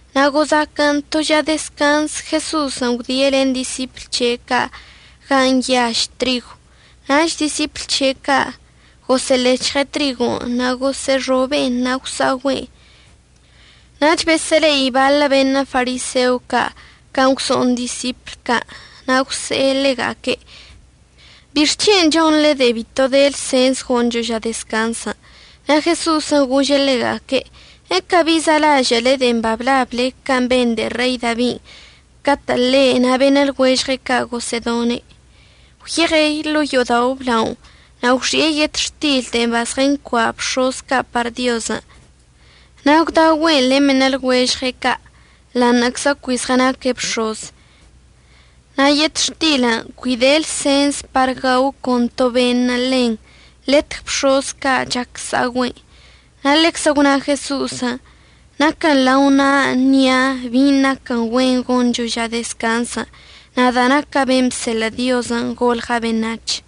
Na' gozaquən to ža dezcanz Jeso'osən' gwdie' len disipl c̱he' ca' gan' nyaž trigon'. Nach disipl c̱he' ca' gosə'əlec̱hɉe' trigon', na' gosə'əxobe'en, na' gwsa'ogüe'en. Nach besə'əle'i baḻə beṉə' fariseo ca' can' gwso'on disipl ca' na' gwse'e ḻega'aque': ―¿Bixc̱hen' chonḻe de'en bito de lsens goncho ža dezcanzən'? Na' Jeso'osən' gože' ḻega'aque': ―¿Ecabi za'alažə'əle de'en bablable can' ben de'e Rei Dabin' catə' ḻe' na' beṉə' lɉuežɉe' ca' gosə'ədone'? Gwyeɉe' ḻo'o yo'odao' əblaonə' na' gwxi'e yetxtil de'en bazɉəncua' bx̱oz ca' par Diozən', na' gwdaogüe'en len beṉə' lɉuežɉe' ca' ḻa'aṉə'əczə cui zɉənaque' bx̱oz. Na' yetxtilən' cui de lsens par gao con to beṉə' ḻen, letg bx̱oz ca' chac əsa'ogüe'en. Na' ḻeczə gwna Jeso'osən': ―Naquən lao na'a əṉia' bin' naquən güen goncho ža dezcanzən', nada' naca' ben' bseḻə' Diozən' golɉa' beṉac̱h.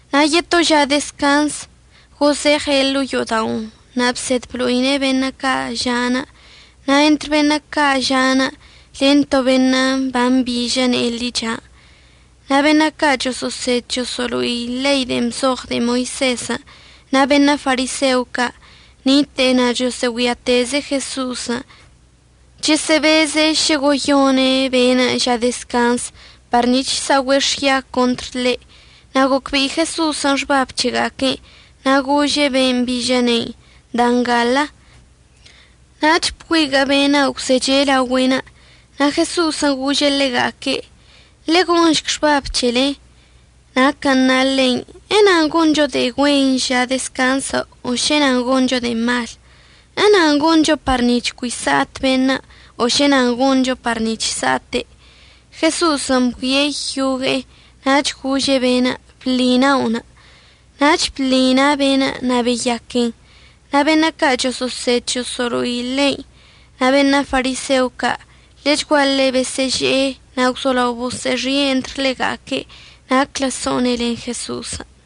Na' yeto ža dezcanz gozeɉe' ḻo'o yo'oda'onə' na' bsed blo'ine' beṉə' ca' ža'anə'. Na' entr beṉə' ca' ža'anə' len to beṉə' bambižə ne'e ḻichan'. Na' beṉə' ca' choso'osed choso'olo'i ḻei de'en bzoɉ de'e Moisezən' na' beṉə' fariseo ca' nite'e na' chosə'əgüiateze' Jeso'osən', chəsə'əbeze' šə goyone' be'enə' ža dezcanzən' par nic̱h əsa'ogüe' xya contr ḻe'. Na' gocbe'i Jeso'osən' xbab c̱hega'aque'enə' na' gože' ben' mbižə ne'inə': ―Da ngalə. Nach bgüiguə' be'enə' gwzeche' laogüe'enə'. Na' Jeso'osən' gože' ḻega'aque': ―Ḻe'e gonšc xbab c̱helen' naquən' na ḻein'. ¿Enan goncho de'e güen ža dezcanzən', o šə nan goncho de'e mal? ¿Enan goncho par nic̱h cui sa'at beṉə' o šə nan goncho par nic̱h sa'ate'? Jeso'osən' bgüie' yogue'e nach gože' be'enə': ―Bḻi na'onə'. Nach bḻi na' be'enə', na' beyaquen. Na' beṉə' ca' choso'osed choso'olo'i ḻein' na' beṉə' fariseo ca' ḻechguaḻe besə'əže'e, na' gwzolao boso'oxi'e entr ḻega'aque' naclə so'one' len Jeso'osən'.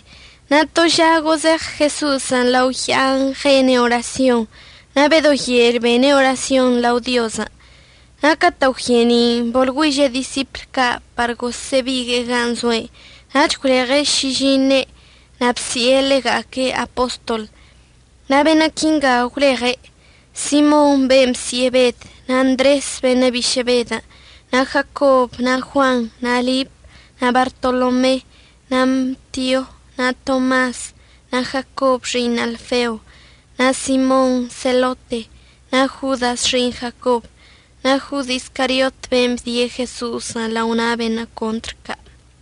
Na' to ža gozeɉ Jeso'osən' lao ya'an ɉene' orasyon. Na' bedo yel bene' orasyon lao Diozən'. Na' catə' gwye'eni'inə' boḻgüiže' disipl ca' par gosə'əbigue'e gan' zoe'enə' nach gwleɉe' šižiṉe' na' əbsi'e ḻega'aque' apostol. Na' beṉə' quingan' gwleɉe': Simon ben' bsi'e Bed, na' Ndres beṉə' bišə' Bedən', na' Jacob, na' Juan, na' Lip, na' Bartolome, na' Matio, na' Tomas, na' Jacob xi'iṉ Alfeo, na' Simon Selote, na' Jodas xi'iṉ Jacob, nach Jod Iscariot ben' əbdie' Jeso'osən' lao na' beṉə' contr ca'.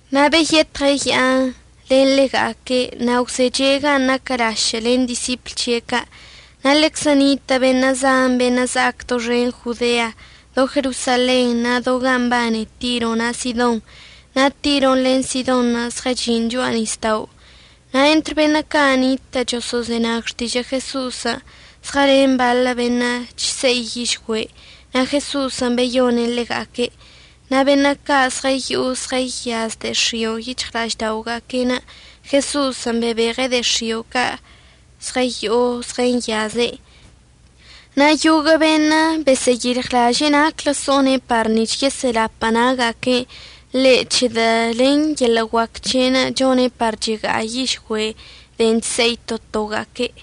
Na' beyetɉe' ya'anə' len ḻega'aque' na' gwzeche' gan' naquə lašə' len disipl c̱he' ca'. Na' ḻeczə nitə' beṉə' zan beṉə' za'ac doxen Jodean', do Jerosalenṉə' na' do gan' mbane Tiro na' Sidon. Na' Tiron' len Sidonṉə' zɉəchi'in cho'a nisda'onə'. Na' entr beṉə' ca' nitə' choso'ozenag xtižə' Jeso'osən' zɉəlen baḻə beṉə' chse'i yižgüe', na' Jeso'osən' beyone' ḻega'aque'. Na' beṉə' ca' zɉəyo'o zɉəyaz de'e x̱io' yic̱hɉla'aždaoga'aque'enə' Jeso'osən' bebeɉe' de'e x̱io' ca' zɉəyo'o zɉəyaze'. Na' yoguə' beṉə' besə'əyilɉlaže'e naclə so'one' par nic̱h yesə'əlapə' na'aga'aquen' ḻe' c̱hedə' len yeḻə' guac c̱he'enə' chone' par chega'a yižgüe' de'en chse'i to toga'aque'.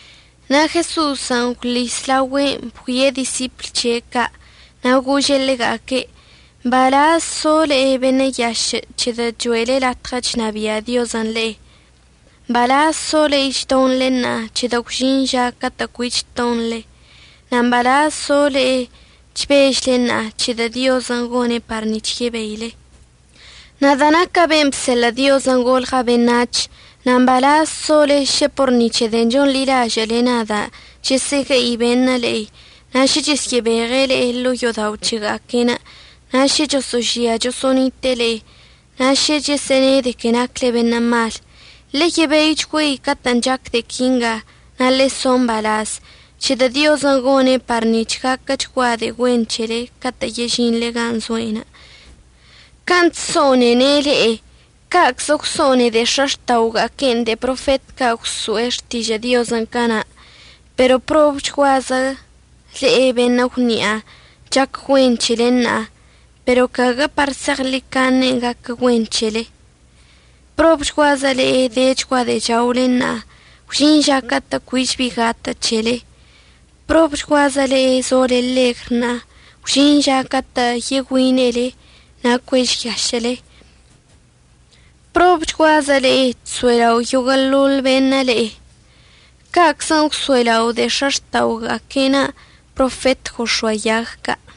Na' Jeso'osən' gwḻis laogüe'enə' bgüie' disipl c̱he' ca' na' gože' ḻega'aque': ―Mbalaz zo le'e beṉə' yašə' c̱hedə' cho'ele latɉə chnabia' Diozən' le'e. Mbalaz so le'e chdonḻe ṉa'a, c̱hedə' gwžin ža catə' cuich tonḻe. Na' mbalaz so le'e chbežle ṉa'a, c̱hedə' Diozən' gone' par nic̱h yebeile. Nada' naca' ben' bseḻə' Diozən' golɉa' beṉac̱h. Na' mbalaz sole šə por ni c̱he de'en chonḻilažə'əle nada' chəsə'əgue'i beṉə' le'e, na' šə chesyə'əbeɉe' le'e ḻo'o yo'odao' c̱hega'aque'enə', na' šə choso'ožia choso'onite'e le'e, na' šə chəsə'əne' de que nacle beṉə' mal. Ḻeyebeichgüei catə'ən chac de'e quinga, na' ḻe'e so mbalaz, c̱hedə' Diozən' gone' par nic̱h gaquəchgua de'e güen c̱hele catə' yežinḻe gan' zoe'enə'. Can' chso'onene' le'e ca'aczən' gwso'one de'e x̱axta'oga'aque'enə' de'e profet ca' gwso'e xtižə' Diozən' cana'. Pero probchguazə le'e beṉə' gwni'a. Chac güen c̱hele ṉa'a, pero caguə par zeɉḻicaṉen' gaquə güen c̱hele. Probchguazə le'e dechgua de'e chaole ṉa'a. Gwžin ža catə' cuich bi gatə' c̱hele. Probchguazə le'e zole ḻegr ṉa'a. Gwžin ža catə' yegüine'ele na' cuežyašə'əle. Probchguazə le'e chso'elao' yoguə'əḻoḻ beṉə' le'e. Ca'aczən' gwso'elao' de'e x̱axta'oga'aquen' profet gox̱oayag ca'.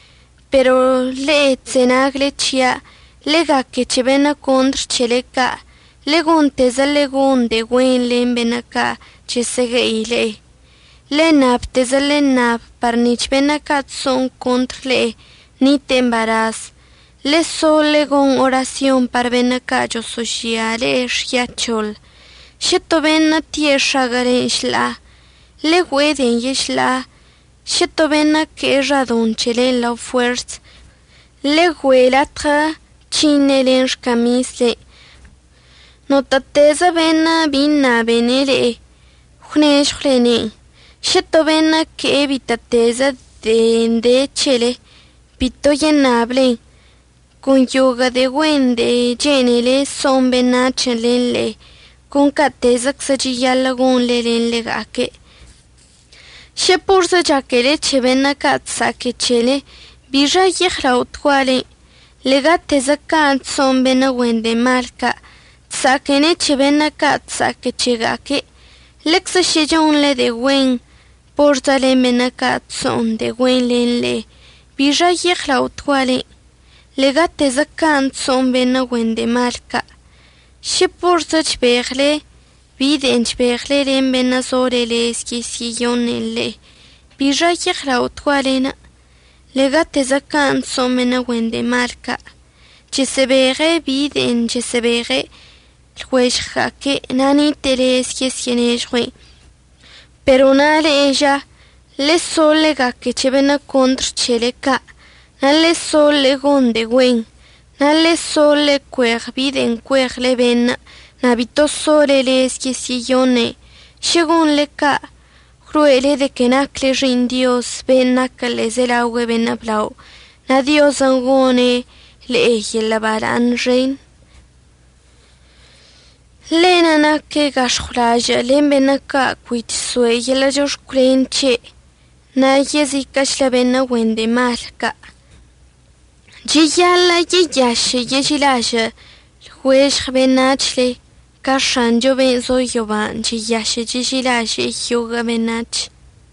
Pero le'e chzenagle c̱hia', ḻe'e gaque c̱he beṉə' contr c̱hele ca', ḻe'e gontezə ḻe'e gon de'e güen len beṉə' ca' chəsə'əgue'i le'e. Ḻe'e ṉabtezə ḻe'e ṉab par nic̱h beṉə' ca' chso'on contr le'e ṉite'e mbalaz. Ḻe'e so ḻe'e gon orasyon par beṉə' ca' choso'ožia le'e xyac̱hoḻ. Šə to beṉə' tie' x̱aguə'əlen' šḻa'a, ḻe'e güe'e de'en yešḻa'a. Šə to beṉə' əque'e xadoṉ c̱helen' ḻa fuers, ḻegüe' latɉə c̱hiṉe' len xcamislen'. Notə'ətezə beṉə' bi ṉabene' le'e, gwnežɉwlene'en. Šə to beṉə' əque'e bitə'ətezə de'en de c̱hele, bito yeṉablen. Con yoguə' de'e güen de'e chene'ele so'on beṉac̱hən' len le'e, con ca'atezəczən' cheyaḻə' gonḻe len ḻega'aque'. Šə porzə chaquele c̱he beṉə' ca' chsa'aque c̱hele, ¿bixa yeɉlaotgualen'? Ḻe'egatezə ca' chso'on beṉə' güen de'e mal ca', chsa'aquene' c̱he beṉə' ca' chsa'aque c̱hega'aque'. Ḻeczə šə chonḻe de'e güen porzə len beṉə' ca' chso'on de'e güen len le'e, ¿bixa yeɉlaotgualen'? Ḻe'egatezə can' chso'on beṉə' güen de'e mal ca'. Šə porzə chbeɉle bi de'en chbeɉle len beṉə' sole lez yesyə'əyoṉe'en le'e, ¿bixa yeɉlaotgualen'? Ḻe'egatezə can' chso'on beṉə' güen de'e malən', chesə'əbeɉe' bi de'en chesə'əbeɉe' lɉuežɉga'aque' na' nite'e lez yesyə'ənežɉue'en. Pero na' le'e ža, ḻe'e so ḻe'e gaque c̱he beṉə' contr c̱hele ca', na' ḻe'e so ḻe'e gon de'e güen. Na' ḻe'e so ḻe'e cueɉ bi de'en cueɉle beṉə' na' bito sole lez yesyə'əyoṉe'en. Šə gonḻe ca', gwlo'ele de que nacle xi'iṉ Dioz ben' naquə ḻe'ezelaogüe beṉə' blao, na' Diozən' goṉe' le'e yeḻə' bala'aṉ xen. Ḻe'enə' naque' gax̱ɉwlažə' len beṉə' ca' cui chso'e yeḻə' chox̱cwlen c̱he' na' yeziquə'əchlə beṉə' güen de'e mal ca'. Cheyaḻə' yeyašə' yeži'ilažə'əle lɉuežɉ beṉac̱hle ca X̱achon' ben' zo yoban' cheyašə' cheži'ilaže'e yoguə' beṉac̱hən'.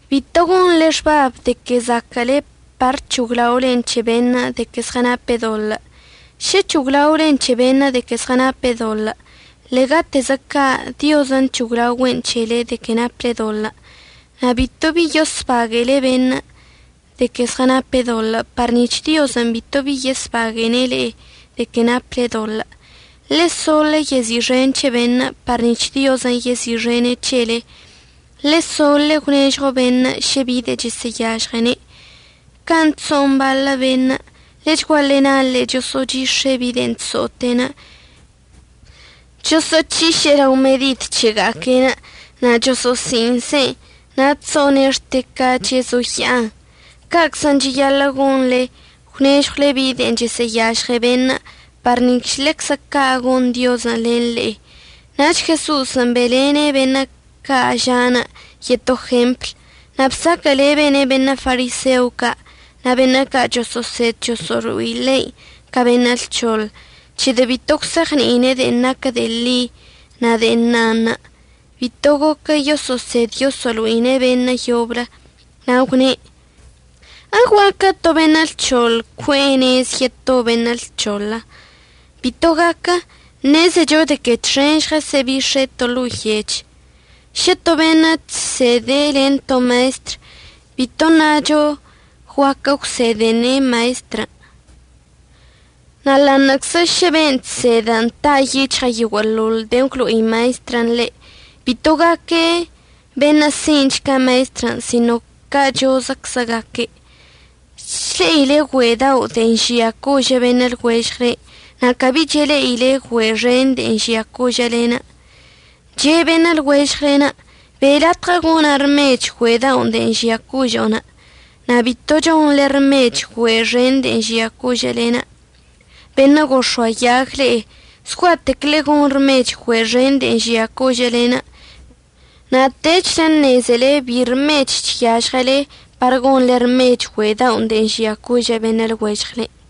Bito gonḻe xbab de que zaquə'əle par c̱hoglaolen c̱he beṉə' de que zɉənape' doḻə'. Šə c̱hoglaolen c̱he beṉə' de que zɉənape' doḻə', ḻe'egatezə ca' Diozən' c̱hoglaogüe'en c̱hele de que naple doḻə'. Na' bito bi yosbague'ele beṉə' de que zɉənape' doḻə' par nic̱h Diozən' bito bi yosbague'ene' le'e de que naple doḻə'. Ḻe'e so ḻe'e yezi'ixen c̱he beṉə' par nic̱h Diozən' yezi'ixene' c̱hele. Ḻe'e so ḻe'e gwnežɉo beṉə' šə bi de'en chəsə'əyažɉene'. Can' chso'on baḻə beṉə' ḻechguaḻe naḻe'e choso'ochix̱e' bi de'en chso'ote'e, chosə'əc̱hiše'e lao medid c̱hega'aque'en na' choso'osi'iṉse'en na' chso'one' xte ca chezoya'an, ca'aczən' cheyaḻə' gonḻe gwnežɉwle bi de'en chəsə'əyažɉe beṉə' par nic̱h ḻeczə ca' gon Diozən' len le'e. Nach Jeso'osən' be'elene' beṉə' ca' ža'anə' yeto jempl. Na' bsaquə'əlebene' beṉə' fariseo ca' na' beṉə' ca' choso'osed choso'olo'i ḻein' ca beṉə' lc̱hoḻ c̱hedə' bito gwse'eɉni'ine' de'en naquə de'e ḻi na' de'e na'anə' bito goquə yoso'osed yoso'olo'ine'en beṉə' yoblə. Na' gwne': ―¿Eguaquə to beṉə' lc̱hoḻ cue'e nez yeto beṉə' lc̱hoḻən'? Bito gaque'. Ṉezecho de que txen žɉəsə'əbix̱e' to ḻo'o yech. Šə to beṉə' chsede' len to maestr, bito ṉacho guaquə əgwsedene' maestrən'. Na' ḻa'aṉə'əczə šə ben' chsed ta' yic̱hɉe' yoguə'əḻoḻ de'en əgwlo'i maestrən' ḻe', bito gaque' beṉə' si'inch ca maestrən', sino cachozəczə gaque'. Chle'ile güe' dao' de'en žia cožə' beṉə' lɉuežɉle na' cabi chele'ile güe' xen de'en žia cožə'əlen'. Che' beṉə' lɉuežɉle: “Be' latɉə gona' rmech güe' daon' de'en žia cožo'o”, na' bito chonḻe rmech güe' xen de'en žia cožə'əlen'. Beṉə' gox̱oayag le'e, zgua'atec ḻe'e gon rmech güe' xenṉə' de'en žia cožə'əlen' na' techlə əṉezele bi rmechən' chyažɉele par gonḻe rmech güe' daon' de'en žia cožə' beṉə' lɉuežɉlen'.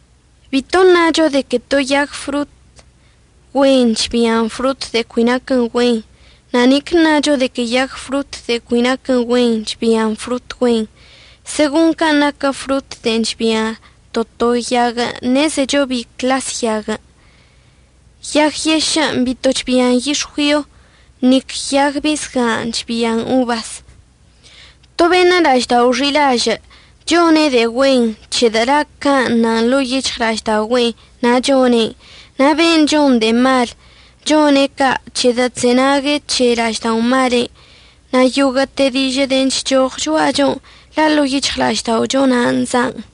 Bito ṉacho de que to yag frot güen chbian frot de'e cui naquə güen, na' nic əṉacho de que yag frot de'en cui naquə güen chbian frot güen. Segon can' naquə frot de'en chbia to to yaguən' ṉezecho bi cḻas yaguən'. Yag yešə' bito chbian yix̱güion', nic yag bisga' chbian obas. To beṉə' la'aždao' xi'ilažə' chone' de'e güen, c̱hedə' la' can' nan ḻo'o yic̱hɉla'ažda'ogüe' nan' chone'. Na' ben' chon de'e mal chone' ca' c̱hedə' chzenague' c̱he la'ažda'omale'enə'. Na' yoguə'əte dižə' de'en chchoɉ cho'achon' la' ḻo'o yic̱hɉla'ažda'ocho na'anə' za'an.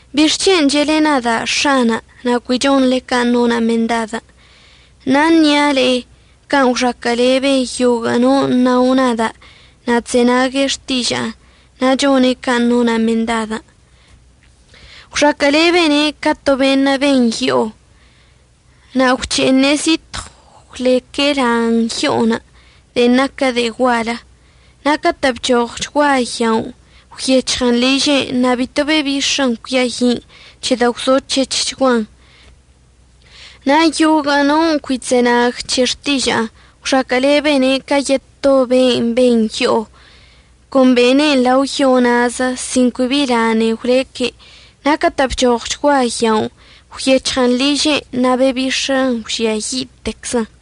¿Bixc̱hen' che'ele nada' “X̱ana'”, na' cui chonḻe can' nona' mendadən'? Ṉa'a ṉia' le'e can' gwxaquə'əlebe yoguə' non' nao nada' na' chzenague' xtiža'anə' na' chone' can' nona' mendadən'. Gwxaquə'əlebene' ca to beṉə' ben yo'o. Na' gwc̱he'eṉe' zitɉw gwleque' lan yo'onə' de'en naquə de'e gual. Na' catə' bchoɉchgua yaonə', gwyec̱hɉən liže'enə' na' bito bebix̱ən cuiayi'in, c̱hedə' gwzo c̱hec̱hchguan. Na' yoguə' non' cui chzenague' c̱he xtiža'anə' gwxaquə'əlebene' ca yeto beṉə' ben yo'o. Con bene'en lao yo na'azə sin cui bi lanei gwleque'. Na' catə' bchoɉchgua yaonə' gwyec̱hɉən liže'enə', na' bebix̱ən gwžiayi'iteczən.